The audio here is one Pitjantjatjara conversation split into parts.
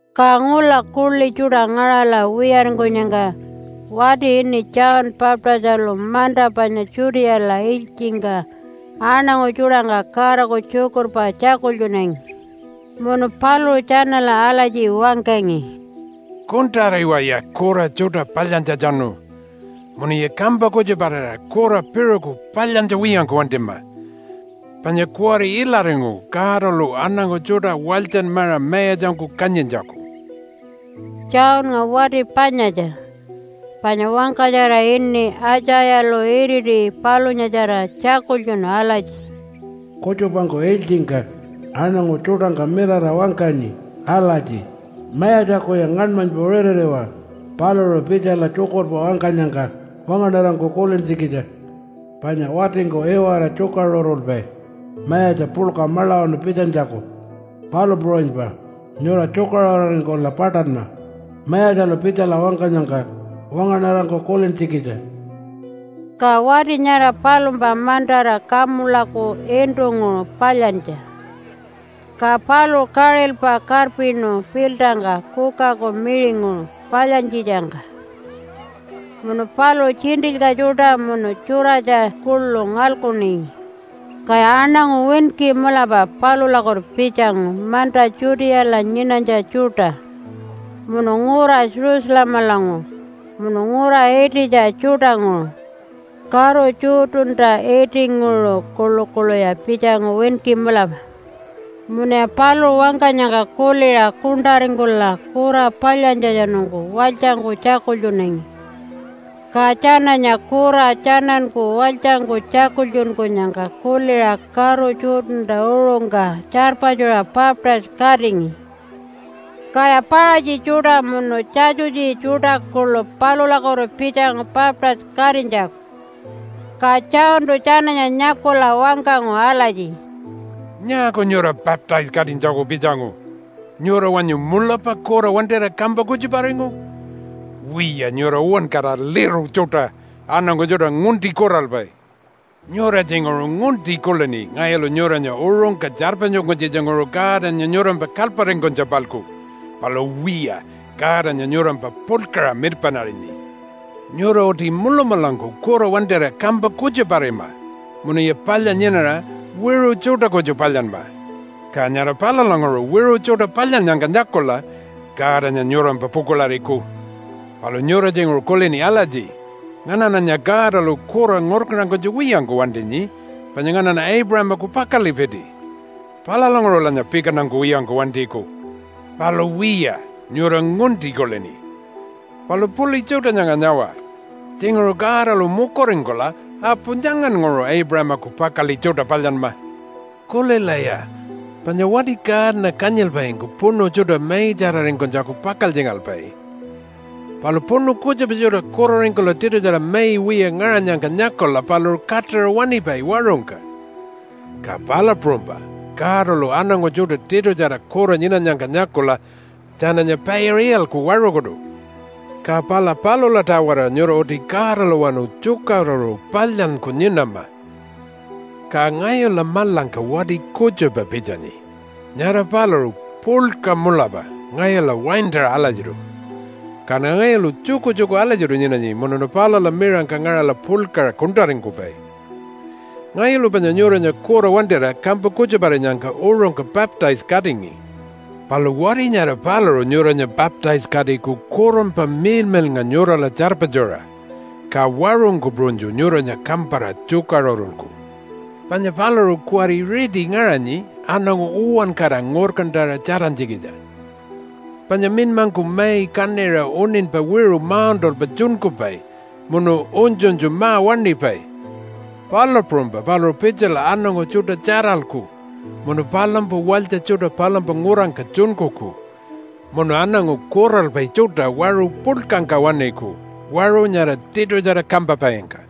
Ka ngula kuḻi tjuṯa ngaṟala wiyaringkunyangka wati ini John Baptistalu manta panya Judeala ilytjingka aṉangu tjuṯangka Godaku tjukurpa tjakultjunangi. Munu paluṟu tjanala alatji wangkangi, “Kuṉṯariwaya kura tjuṯa palyantjatjanu munuya kampa kutjuparira kura piṟuku palyantja wiyangku wantima, panya kuwari ilaringu Godalu aṉangu tjuṯa walytjanmaṟa mayatjangku kanyintjaku.” Johnnga wati panyatja, panya wangkatjara ini Aitjayalu iriti palunyatjara tjakultjunu alatji, “Kutjupangku ilytjingka aṉangu tjuṯangka mirara wangkanyi alatji, ‘Mayatjakuya ngaṉmanypa ritiriwa paluṟu pitjala tjukurpa wangkanyangka wangaṉarangku kulintjikitja. Panya watingku iwara tjukaṟurulpai mayatja puḻka maḻawanu pitjanytjaku, palu puṟunypa nyura tjukaṟururingkula paṯanma Mayatjalu pitjala wangkanyangka wangaṉarangku kulintjikitja.’” Ka wati nyara palumpa mantara kamulaku iṉṯunguṟu palyantja, ka paluṟu kaṟilpa karpinu piltangka kukaku miṟinguṟu palyantjitjangka. Munu paluṟu tjiṉṯilyka tjuṯa munu tjuratja kuḻu ngalkuningi. Kaya aṉangu winki mulapa palulakutu pitjangu manta Judeala nyinanytja tjuṯa. Munu ngura Jerusalemalanguṟu, munu ngura ititja tjuṯanguṟu, karu Jordanta itinguṟu kuḻukuḻuya pitjangu winki mulapa. Munuya paluṟu wangkanyangka kuliṟa kuṉṯaringkula kura palyantjatjanungku walytjangku tjakultjunangi. Ka tjananya kura tjananku walytjangku tjakultjunkunyangka kuliṟa karu Jordanta uṟungka tjarpatjuṟa baptise-katingi. Kaya Paṟatji tjuṯa munu Tjatjutji tjuṯa kuḻu palulakutu pitjangu baptise-katinytjaku. Ka Johntu tjananya nyakula wangkangu alatji, “Nyaaku nyura baptise-katinytjaku pitjangu? Nyura wanyu mulapa kura wantira kampa kutjuparingu? Wiya, nyura uwankara liru tjuṯa aṉangu tjuṯa ngunti kuralpai! Nyura tjinguṟu ngunti kulini ngayulu nyuranya uṟungka tjarpatjunkunytjitjanguṟu Godanya nyurampa kalyparingkunytja-palku. Palu wiya, Godanya nyurampa puḻkaṟa mirpaṉarinyi. Nyura uti mulamulangku kura wantira kampa kutjuparima munuya palya nyinara wiṟu tjuṯa kutju palyanma, ka nyara palulanguṟu wiṟu tjuṯa palyannyangka nyakula Godanya nyurampa pukuḻariku. Palu nyura tjinguṟu kulini alatji, ‘Nganaṉanya Godalu kura ngurkantankunytja wiyangku wantinyi panya nganaṉa Aipuṟamaku pakaḻipiti. Palulanguṟulanya pikantankuwiyangku wantiku.’ Palu wiya, nyura ngunti kulini. Palu puḻi tjuṯa nyanga nyawa! Tjinguṟu Godalu mukuringkula apu nyangannguṟu Aipuṟamaku pakaḻi tjuṯa palyanma. Kulilaya! Panya wati kaana kanyilpaingku puṉu tjuṯa maitjararingkunytjaku pakaltjingalpai, palu puṉu kutjupa tjuṯa kuraringkula tiṯutjara mai wiya ngaṟanyangka nyakula paluṟu kaṯaṟa waṉipai waṟungka, ka palu puṟunypa Godalu aṉangu tjuṯa tiṯutjara kura nyinanyangka nyakula tjananya paiṟa iyalku waṟukutu. Ka pala palula-tawara nyura uti Godalawanu tjukaṟuru palyanyku nyinama. “Ka ngayula maḻangka wati kutjupa pitjanyi. Nyara paluṟu puḻka mulapa ngayula waintaṟa alatjiṯu. Kaṉa ngayulu tjukutjuku alatjiṯu nyinanyi munuṉa palula miṟangka ngaṟala puḻkaṟa kuṉṯaringkupai. Ngayulu panya nyuranya kura wantira kampa kutjuparinyangka uṟungka baptise-katingi. Palu wati nyara paluṟu nyuranya baptise-katiku Kurunpa Miḻmiḻnga nyurala tjarpatjuṟa, ka waṟungku puṟunytju nyuranya kampara tjukaṟurulku. Panya paluṟu kuwari riti ngaṟanyi aṉangu uwankara ngurkantaṟa tjarantjikitja, panya minymangku mai kaṉiṟa uṉinypa wiṟu mauṉṯalpa tjunkupai munu unytjunytju ma-waṉipai, palu puṟunypa paluṟu pitjala aṉangu tjuṯa tjaralku munu palumpa walytja tjuṯa palumpa ngurangka tjunkuku munu aṉangu kuralpai tjuṯa waṟu puḻkangka waṉiku waṟu nyara tiṯutjara kampapaingka.”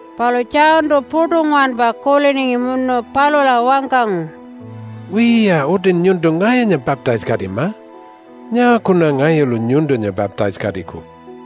Palu Johntu puṯu nguwanpa kuliningi munu palula wangkangu, “Wiya, utin nyuntu ngayunya baptise-katima. Nyaakuṉa ngayulu nyuntunya baptise-katiku?”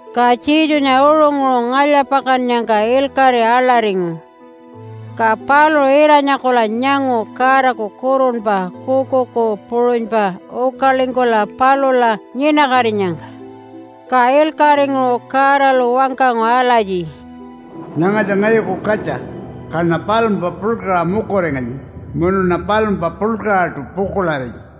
Ka Jesunya uṟunguṟu ngalya-pakannyangka ilkaṟi aḻaringu, ka paluṟu ira-nyakula nyangu Godaku Kurunpa kuukuuku puṟunypa ukalingkula palula nyinakatinyangka. Ka ilkaṟinguṟu Godalu wangkangu alatji, “Nyangatja ngayuku katja, kaṉa palumpa puḻkaṟa mukuringanyi munuṉa palumpa puḻkaṟaṯu pukuḻarinyi.”